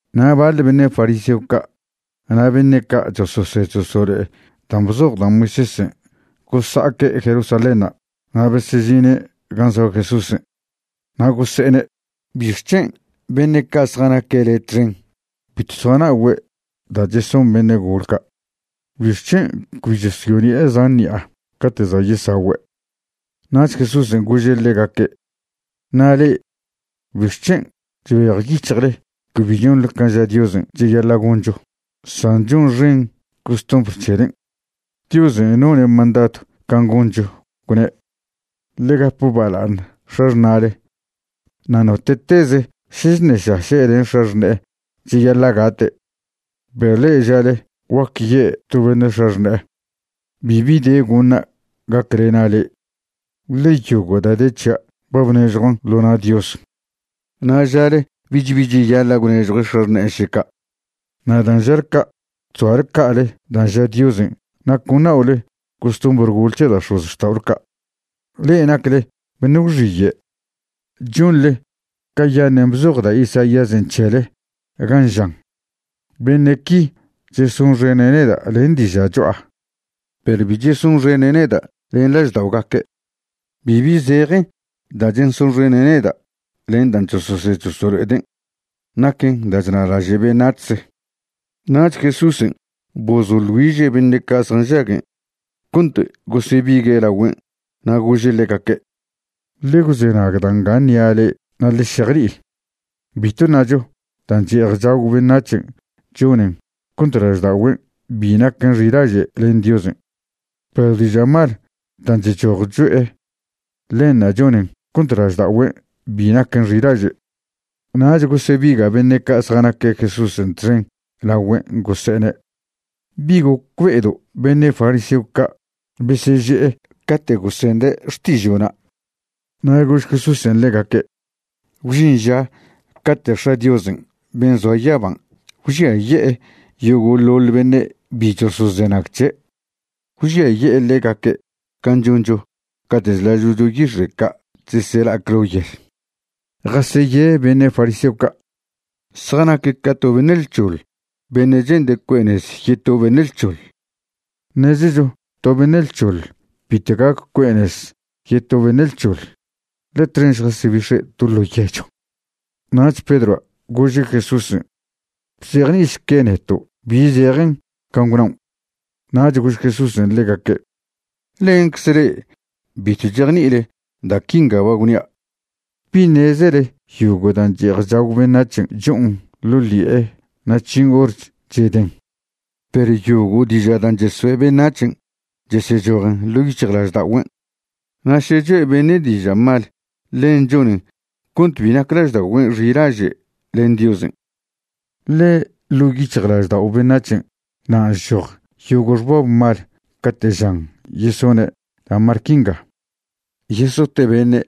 Na' baḻ beṉe' fariseo ca' na' beṉe' ca' chososed chosolo'e dan' bzoj da' Moisésen' gosa'aque' Jerusalénṉa' na' besežine' gan' zoa Jesúsen', na' gose'ene': ―¿Bixc̱hen' beṉe' ca' zjanaque' le' txen bitw zjana'ogüe' da' cheson beṉe' gol ca'? ¿Bixc̱hen' cbi chosyone'e zan ṉi'a cate' za' yesagüe'? Nach Jesúsen' gože' ḻegaque': ―Na' le'e ¿bixc̱hen' chbejyic̱hjle cbi chonḻe can' ža Diosen' cheyaḻa' goncho san chonxen costumbr c̱helen'? Diosen' none' mandadw can' goncho, gwne': “Ḻe gap bala'aṉ x̱axṉa'le”, na' “Note'teze' še chṉešaše' len x̱axṉe'e cheyaḻa' gate'.” Perw le'e žale guaque ye' to beṉe' x̱axṉe'e: “Bibi de goṉa' gaclena' le'e, ḻe yogo' da' de c̱hia' ba bnežjuan' ḻo na' Dios.” Na' žale bich bi cheyaḻa' gwnežjue' x̱axṉe'en še ca'. Na' dan' žale ca', chzoale ca'ale dan' ža Diosen' na' con na'ole costumbr gole c̱he da' x̱ozxta'ole ca'. Le'e nacle beṉe' gwxiye'. Chonḻe cayaṉen' bzoj da' Isaíasen' c̱hele, gan' žan: Beṉe' qui chesonxene' neda' len diža' cho'a, perw bi chesonxene' neda' len lažda'ogaque'. Bibi zejen dan' chesonxene' neda', ḻe dan' chososed chosolo'eden' naquen da' chnalaže' beṉac̱hze. Nach Jesúsen' bozoḻ güiže' beṉe' ca' zjanžaguen' cont gosebigue' lagüen' na' gože' ḻegaque': ―Ḻe gwzenag da' nga ṉia' le'e na' ḻe šejni'i. Bitw ṉacho dan' che'ej chagw beṉac̱hen' chonen cont lažda'ogüen' bi naquen xilaže' len Diosen'. Perw diža' mal dan' chchoj cho'e, ḻenṉa' chonen cont lažda'ogüen' bi naquen xilaže'. Nach gosebiga' beṉe' ca' zjanaque' Jesúsen' txen lagüen' gose'ene': ―¿Bi gocbe'edo' beṉe' fariseo ca' beseže'e cate' gosende' xtižo'na'? Na' gož Jesúsen' ḻegaque': ―Gwžin ža cate' X̱a' Diosen' ben' zoa yaban' gwžiaye'e yogo'ḻoḻ beṉe' bi chosozenag c̱he'. Gwžiaye'e ḻegaque' can' choncho cate' chlažo'cho yix̱e' ca' chesela'ac ḻo yel. Jaseye beṉe' fariseo ca'. Zjanaque' ca to beṉe' lc̱hoḻ beṉe' che'nde' cue'e nez yeto beṉe' lc̱hoḻ. Ṉezecho to beṉe' lc̱hoḻ bitw gac cue'e nez yeto beṉe' lc̱hoḻ, ḻe txen šjasebix̱e' to ḻo' yechw. Nach Pedroa' gože' Jesúsen': ―Bzejni'išque neto' bi zejen can' gwnaon'. Nach gož Jesúsen' ḻegaque': ―¿Lencze le'e bitw chejni'ile da' quinga ba gwnia'? ¿Bi ṉezele yogo' dan' che'ej chagw beṉac̱hen' cho'on ḻo' ḻi'e na' chžin hor cheden? Perw yogo' diža' dan' chesoe' beṉac̱hen' chesechojen ḻo' yic̱hjlažda'ogüen'. Na' še choe' beṉe' diža' mal, ḻen chonen cont bi nac lažda'ogüen' xilaže' len Diosen'. Ḻe ḻo' yic̱hjlaždao' beṉac̱hen' nan' chchoj yogo' xbab mal cate' žan yesone' da' mal quinga: yesote' beṉe',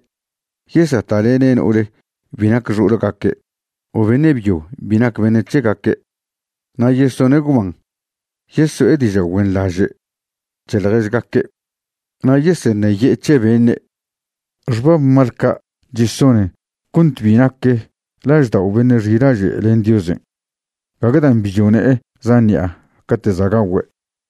yesata'lene' no'ol bi nac xo'olgaque' o beṉe' byo bi nac beṉe' c̱hegaque', na' yesone' gwban, yeso'e diža' güenḻaže' c̱he ḻježgaque', na' yeseṉeye'e c̱he beṉe'. Xbab mal ca' chesonen cont bi nac laždao' beṉe' xilaže' len Diosen', gague dan' bi chone'e zan ṉi'a cate' za' gagüe'.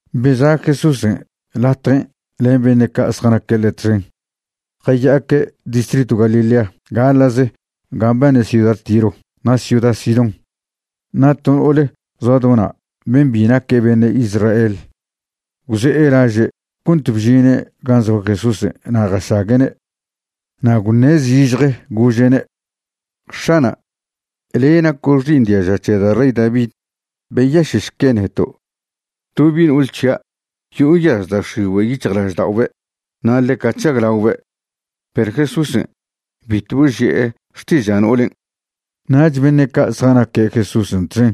Beza' Jesúsen' latjen' len beṉe' ca' zjanaque' ḻe' txen jaya'aque' distritw Galilea gaḻa'ze gan' mbane ciuda Tiro na' ciuda Sidón. Na' to no'ole zoa do na', ben' bi naque' beṉe' Israel, gwze'e laže' cont bžine' gan' zoa Jesúsen' na' jašague'ne'. Na' gwṉe' zižje, gože'ne': ―X̱ana', le' naco' xi'iṉ diaža c̱he da' rey David. Beyaše'šque neto'. To bi' no'ol c̱hia' yo'o nyaz da' x̱igüe' yic̱hjlažda'obe' na' ḻeca chžaglaobe'. Perw Jesúsen' bitw boži'e xtiža' no'olen'. Nach beṉe' ca' zjanaque' Jesúsen' txen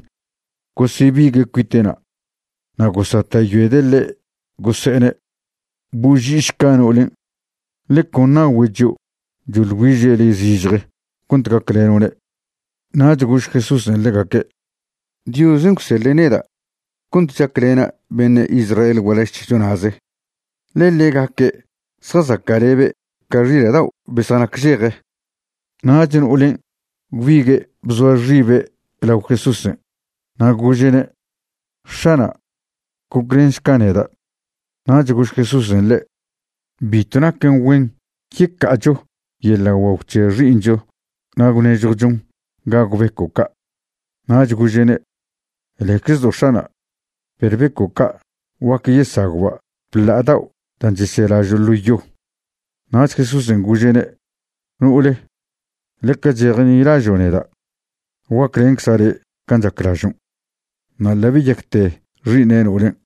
gosebigue' cuite'na' na' gosata'yoede' ḻe' gose'ene': ―Boži'išca no'olen', ḻe con nagüe' chio' choḻ güiže' le' zižje cont gacleno'ne'. Nach gož Jesúsen' ḻegaque': ―Diosen' gwseḻe' neda' cont chaclena' beṉe' Israel gualaž c̱hecho na'ze, ḻe ḻegaque' zjazaca'lebe' ca xila' dao' be zjanacžeje. Nach no'olen' gwbigue' bzoa xibe' lao Jesúsen', na' gože'ne': ―X̱ana', goclenšca neda'. Nach gož Jesúsen' ḻe': ―Bitw naquen güen yeca'acho yeḻa' guagw c̱he xi'iṉcho na' gwnežjwchon gagw beco' ca'. Nach gože'ne': ―Leczdo' X̱ana'. Perw beco' ca' guac yesagwba' bḻa'a dao' da' cheselažo' ḻo yo. Nach Jesúsen' gože'ne': ―No'ole, ḻeca chejnilažo' neda'. Guaclencza' le' can' chaclažon'. Na' ḻa' beyacte xi'iṉ no'olen'.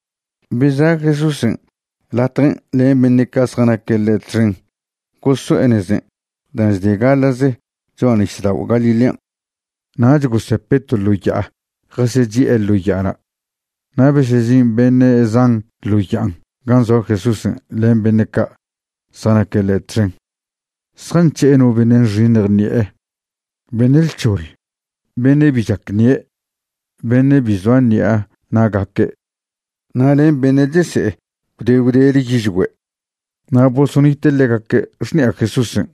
Beza' Jesúsen' latjen' len beṉe' ca' zjanaque' ḻe' txen goso'e nezen' dan' chde gaḻa'ze cho'a nisdao' Galilean'. Nach gosepe' to ḻo ya'a jasechi'e ḻo ya'ana'. Na' besežin beṉe' zan ḻo ya'a gan' zoa Jesúsen' len beṉe' ca' zjanaque' ḻe' txen. Zjanc̱he'e no beṉe' nxiṉj ṉi'e, beṉe' lc̱hoḻ, beṉe' bi chac ṉie', beṉe' bi zoa ṉi'a na'gaque', na' len beṉe' chese'e gwde gwdele yižgüe', na' bosonite' ḻegaque' xṉi'a Jesúsen'.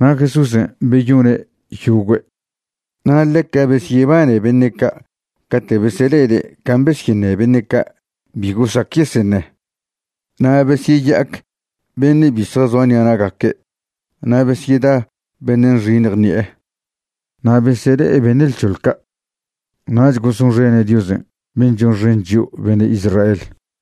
Na' Jesúsen' beyone' yogüe'. Na' ḻeca besyebane beṉe' ca' cate' besele'ede' can' besyeṉe beṉe' ca' bi gosac yeseṉe, na' besyeyac beṉe' bi zjazoa ṉi'a na'gaque', na' besyeda beṉe' nxiṉj ṉi'e, na' besele'e beṉe' lc̱hoḻ ca'. Nach gosonxene' Diosen' ben' chonxen chio' beṉe' Israel.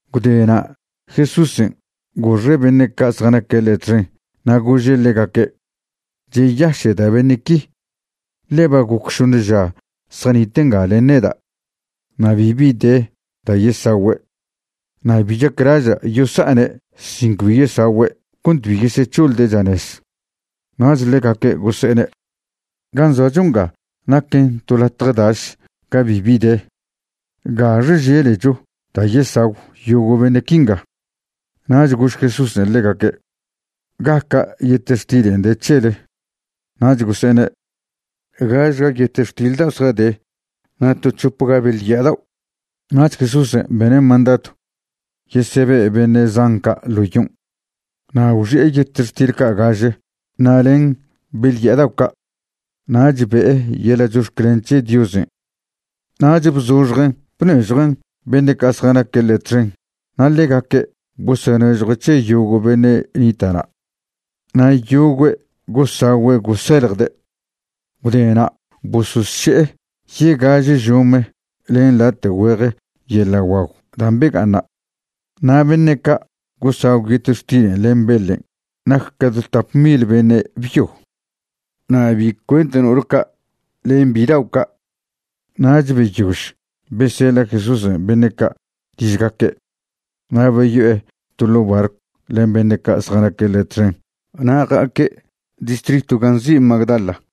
Gwde na' Jesúsen' goxe' beṉe' ca' zjanaque' ḻe' txen na' gože' ḻegaque': ―Cheyaše'da' beṉe' qui, ḻe ba goc šoṉe ža zjanite' nga len neda', na' bibi de da' yesagüe'. Na' bi chaclaža' yosa'ane' sin cbi yesagüe' cont bi yesec̱hoḻde' chanez. Nach ḻegaque' gose'ene': ―Gan' zoacho nga naquen to latje daš ga bibi de. ¿Gaxe želecho da' yesagw yogo' beṉe' quinga? Nach gož Jesúsen' ḻegaque': ―¿Gaca' yetextilen' de c̱hele? Nach gose'ene': ―Gažga yetextil dao' zjade na' to c̱hopga beḻ ya'a dao'. Nach Jesúsen' bene' mandadw yesebe' beṉe' zan ca' ḻo yon'. Na' gwxi'e yetextil ca' gaže na' len beḻ ya'a dao' ca', nach be'e yeḻa' chox̱clen c̱he Diosen', nach bzoxjen' bnežjuen' beṉe' ca' zjanaque' ḻe' txen na' ḻegaque' bosonežjue' c̱he yogo' beṉe' nita' na'. Na' yogüe' gosagüe' goseljde'. Gwdena' bososše'e yegaže žome len late' güeje yeḻa' guagw dan' bega'aṉna'. Na' beṉe' ca' gosagw yetextilen' len beḻen' nac tap mil beṉe' byo, na' bi cuent no'ole ca' len bidao' ca'. Nach beyož beseḻa' Jesúsen' beṉe' ca' ližgaque', na' beyo'e to ḻo' barcw len beṉe' ca' zjanaque' ḻe' txen na' ja'aque' distritw gan' nzi' Magdala.